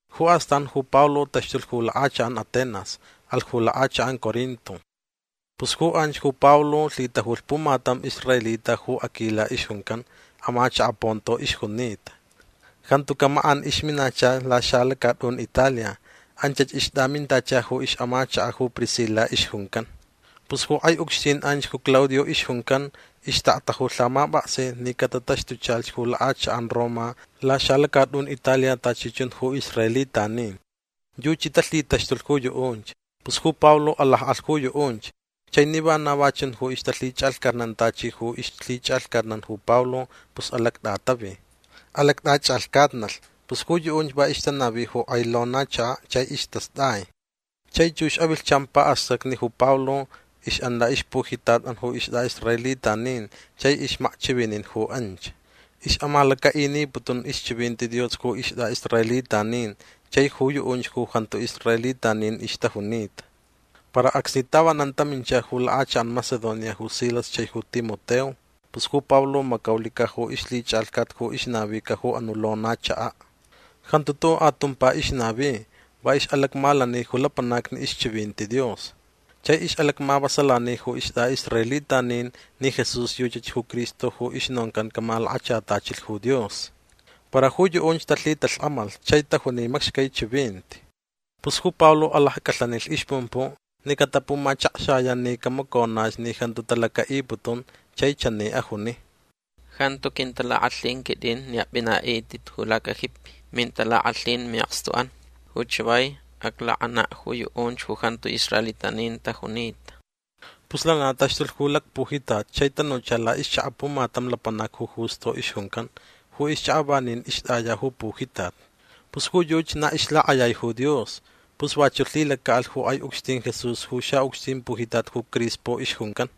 Ju astan ju Pablo taxtulh ju lak'achak'an Atenas. Alh ju lak'achak'an Corinto. Pus ju anch ju Pablo lhitajulh pumatam israelita ju Aquila ixjuncan. Amachaka' Ponto ixjunita. Jantuca' mak'an ixminacha ju laxalacat'un Italia. Anchach ixt'amintacha ju ix'amachaka' ju Priscila ixjuncan. Pus ju k'ai ucxtin anch ju Claudio ixjuncan ixtakta ju lhamap'aksin ni catataxtuchalhch ju lak'achak'an Roma laxalacat'un Italia tachi chun ju israelitanin. Yuchi talhitaxtulh ju yu'unch. Pus ju Pablo alak'alh ju yu'unch. Chai ni vana va chunch ju ixtalhich'alhcatnan tachi ju ixlhich'alhcatnan ju Pablo pus alact'atavi. Alact'ach'alhcatnalh. Pus ju yu'unch va ixtanavi ju k'ai lona chaka' chai istast'ai. Chai chux avilhchan pa'astacni ju Pablo ix'an la'ixpujitat'an ju ist'a'israelitanin chai ixmakchivinin ju anch. Ix'amalaca'iniputun ixchivinti Dios ju ist'a'israelitanin chai ju yu'unch ju jantu israelitanin ixtajunita. Para acsni tavanan tamincha ju lak'achak'an Macedonia ju Silas chai ju Timoteo pus ju Pablo macaulica' ju ixlhich'alhcat ju ixnavica ju anu' lona chaka'. Jantu tu'u' atumpa ixnavi. Va ix'alacmalani ju lapanacni ixchivinti Dios. Chai ix'alacmavasalani ju ist'a'israelitanin ni Jesús yuchach ju Cristo ju ixnoncan camalakachatachilh ju Dios. Para ju yu'unch talhitalhk'amalh chai tajuni macxcai chivinti. Pus ju Pablo alacc'alhanilh ixpumpu' ni catapumachakxaya' ni camaconach ni jantu talaca'iputun. Chai chani ajuni: ―Jantu quintalak'alhin quit'in ni ap'ina'it'it ju lacajipi. Mintalak'alhin mi'akstu'an. Ju chavai aclak'ana' ju yu'unch ju jantu israelitanin tajunita. Pus lana taxtulh ju lacpujitat chai tanucha la'ixchaka' pumatam lapanac ju Justo ixjuncan. Ju ixchaka' vanin ixt'aya ju pujitat. Pus ju yuchi na ixlak'ayai ju Dios. Pus vachu' lhilaca'alh ju k'ai ucxtin Jesús ju xa'ucxtin pujitat ju Crispo ixjuncan.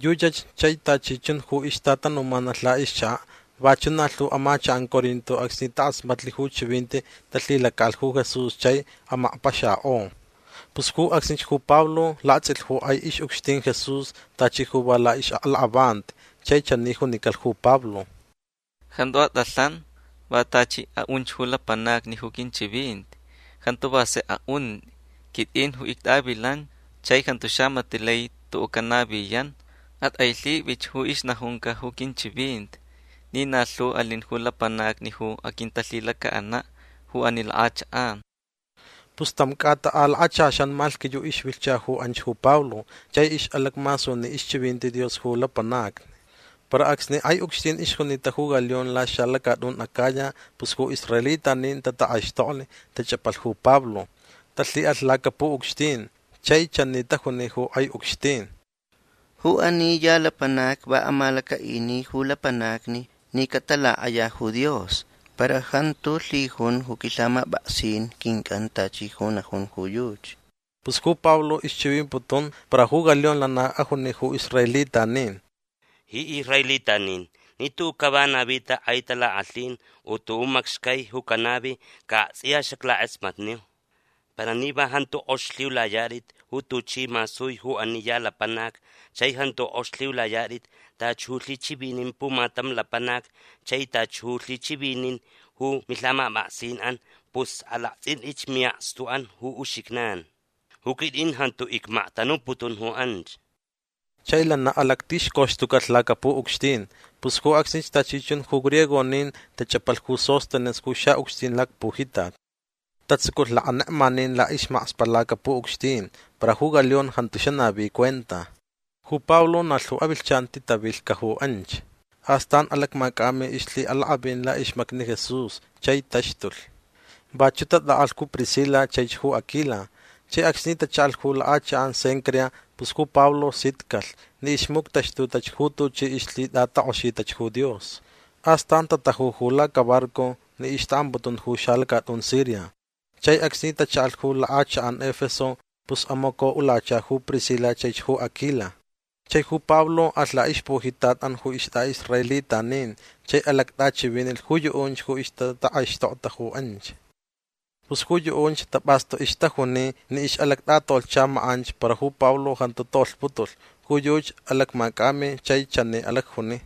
Yuchach chai tachi chun ju ixtatanumanalh la'ixchaka'. Vachu' na lhu amachak'an Corinto acsni tak'asmatlh ju chivinti talhilaca'alh ju Jesús chai amakpaxak'o. Pus ju acsnich ju Pablo lakts'ilh ju k'ai ix'ucxtin Jesús tachi ju va la'ix'aklak'avanti. Chai chani junicalh ju Pablo: ―Jantu at'alhan. Va tachi a'un ju lapanacni ju quinchivinti. Jantu va sek a'unt'i. Quit'in ju ict'avilan chai jantu xamati' lai tu'u' canaviyan. At'ailhip'ich ju ixnajunca ju quinchivinti ni na lhu alin ju lapanacni ju aquintalhilaca'ana' ju ani lak'achak'an. Pus tam c'ata a lakachaxan malhquiyu' ixvilhcha ju anch ju Pablo. Chai ix'alacmasuni ixchivinti Dios ju lapanacni. Para acsni k'ai ucxtin ixjunita ju Galión laxalacat'un Acaya pus ju israelitanin tatak'aixtoklh. Tach'apalh ju Pablo. Talhi'alh lacapu'ucxtin. Chai chani tajuni ju k'ai ucxtin: ―Ju ani ya lapanac va amalaca'ini ju lapanacni ni catalak'aya ju Dios para jantu lhijun ju quilhamap'aksin quinc'an tachi ju najun ju yuchi. Pus ju Pablo ixchivimputun para ju Galión lana ajuni ju israelitanin: ―Ji israelitanin ni tu'u' cava navit'a k'ai talak'alhin u tu'u' macxcai ju canavi ca akts'iya xaclak'asmatniu. Para ni va jantu k'ox lhiulayat'it ju tuchi masui ju ani ya lapanac chai jantu k'ox lhiulayat'it tachi ju lhichivinin pumatam lapanac chai tachi ju lhichivinin ju milhamap'aksin'an pus alakts'int'itch mi'akstu'an ju uxijnan. Ju quit'in jantu icmaktanuputun ju anch. Chai lana alactixcoxtucalh lacapu'ucxtin. Pus ju acsnich tachi chun ju griegonin tach'apalh ju Sóstenes ju xa'ucxtin lacpujitat. Tatsuculh lakanekmanin la'ismakspa' lacapu'ucxtin. Para ju Galión jantu xanavi cuenta. Ju Pablo na lhu avilhchan titavilhca' ju anch. Astan alacmac'ami ixlhi'alak'avin la'ixmacni Jesús chai taxtulh. Vachu' tat'a'alh ju Priscila chaich ju Aquila. Chai acsni tacha'alh ju lak'achak'an Cencrea pus ju Pablo sitcalh ni ixmuctaxtutach ju tuchi ixlhit'atak'oxitach ju Dios. Astan tataju ju lacabarco ni ixta'amputun ju xalacat'un Siria. Chai acsni tacha'alh ju lak'achak'an Efeso pus amaco'ulacha ju Priscila chaich ju Aquila. Chai ju Pablo alh la'ixpujitat'an ju ist'a'israelitanin chai alact'achivinilh ju yu'unch ju ixtatak'aixtokta ju anch. Pus ju yu'unch tap'astu ixtajuni ni ix'alact'atolhcha mak'anch para ju Pablo jantu tolhputulh. Ju yuchi alacmac'ami chai chani alacjuni: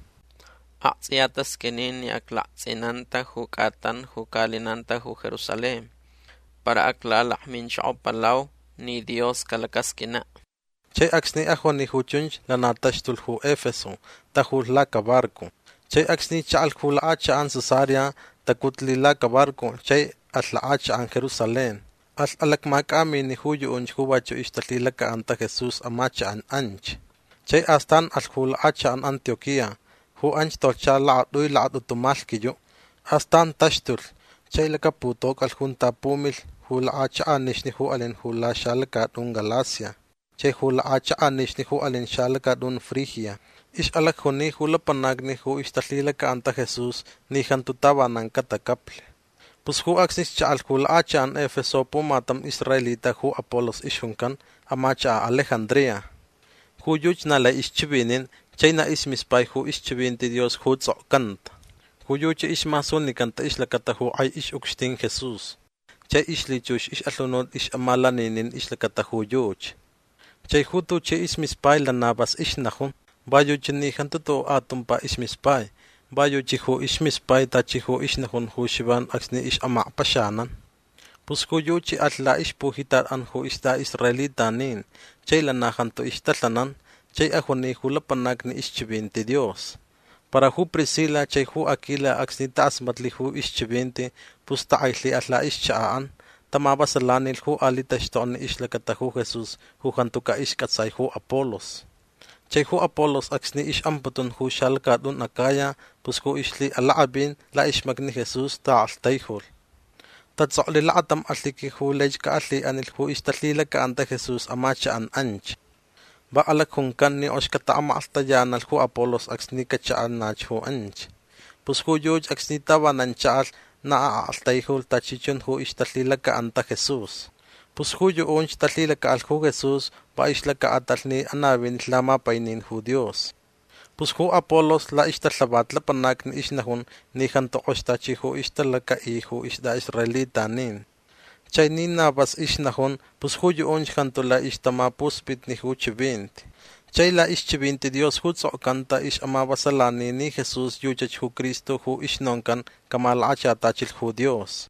―Akts'iya tasq'uini ni aclakts'inanta ju c'atan ju ca'alinanta ju Jerusalén. Para aclalakminchokopalau ni Dios calacasq'uina'. Chai acsni ajuni ju chunch lana taxtulh ju Efeso. Tajulh lacabarco. Chai acsni cha'alh ju lak'achak'an Cesarea tacutlh lacabarco chai alh lak'achak'an Jerusalén. Alh alacmac'amini' ju yu'unch ju vachu' ixtalhilaca'anta Jesús amachak'an anch. Chai astan alhch ju lak'achak'an Antioquía. Ju anch tolhcha lakat'ui lakat'utu malhquiyu'. Astan taxtulh chai lacaputoc'alh junta pumilh ju lak'achak'anixni ju alin ju laxalacat'un Galacia chai ju lak'achak'anixni ju alin ju xalacat'un Frigia. Ix'alacjuni ju lapanacni ju ixtalhilaca'anta Jesús ni jantu tavanan catacaplh. Pus ju acsnich cha'alh ju lak'achak'an Efeso pumatam israelita ju Apolos ixjuncan. Amachaka' Alejandría. Ju yuchi na lai ixchivinin chai na ismispai ju ixchivinti Dios ju ts'okcanta. Ju yuchi ismasunicanta ixlacata ju k'ai ix'ucxtin Jesús chai ixlhichux ix'alhunut ix'amalaninin ixlacata ju yuchi. Chai ju tuchi ismispai lana vas ixnajun. Va yuchi ni jantu tu'u' atumpa ismispai. Va yuchi ju ismispai tachi ju ixnajun ju Xivan acsni ix'amakpaxanan. Pus ju yuchi alh la'ixpujitat'an ju ist'a'israelitanin chai lana jantu ixtalhanan. Chai ajuni ju lapanacni ixchivinti Dios. Para ju Priscila chai Aquila acsni tak'asmatlh ju ixchivinti pus tak'ailhi'alh la'ixchaka'an. Tamavasalanilh ju ali' taxtokni ixlacata ju Jesús ju jantuca' isc'atsai ju Apolos. Chai ju Apolos acsni ix'amputun ju xalacat'un Acaya pus ju ixlhi'alak'avin la'ixmacni Jesús ta'aktaijulh. Tats'oklh lakatam alhiqui ju laich ca'alhi'anilh ju ixtalhilaca'anta Jesús amachak'an anch. Va alacjuncan ni k'ox cata'amaklhtayanalh ju Apolos acsni cacha'anach ju anch. Pus ju yuchi acsni tavanan cha'alh na a'aktaijulh tachi chun ju ixtalhilaca'anta Jesús. Pus ju yu'unch talhilaca'alh ju Jesús va ixlaca'atalh ni anavinilh lamapainin ju Dios. Pus ju Apolos la'ixtalhavat lapanacni ixnajun ni jantu k'ox tachi ju ixtalaca'i ju ist'a'israelitanin. Chai ni na vas ixnajun pus ju yu'unch jantu lai ixtamapusp'itni ju chivinti. Chai la'ixchivinti Dios ju ts'okcanta ix'amavasalani ni Jesús yuchach ju Cristo ju ixnoncan camalakachatachilh ju Dios.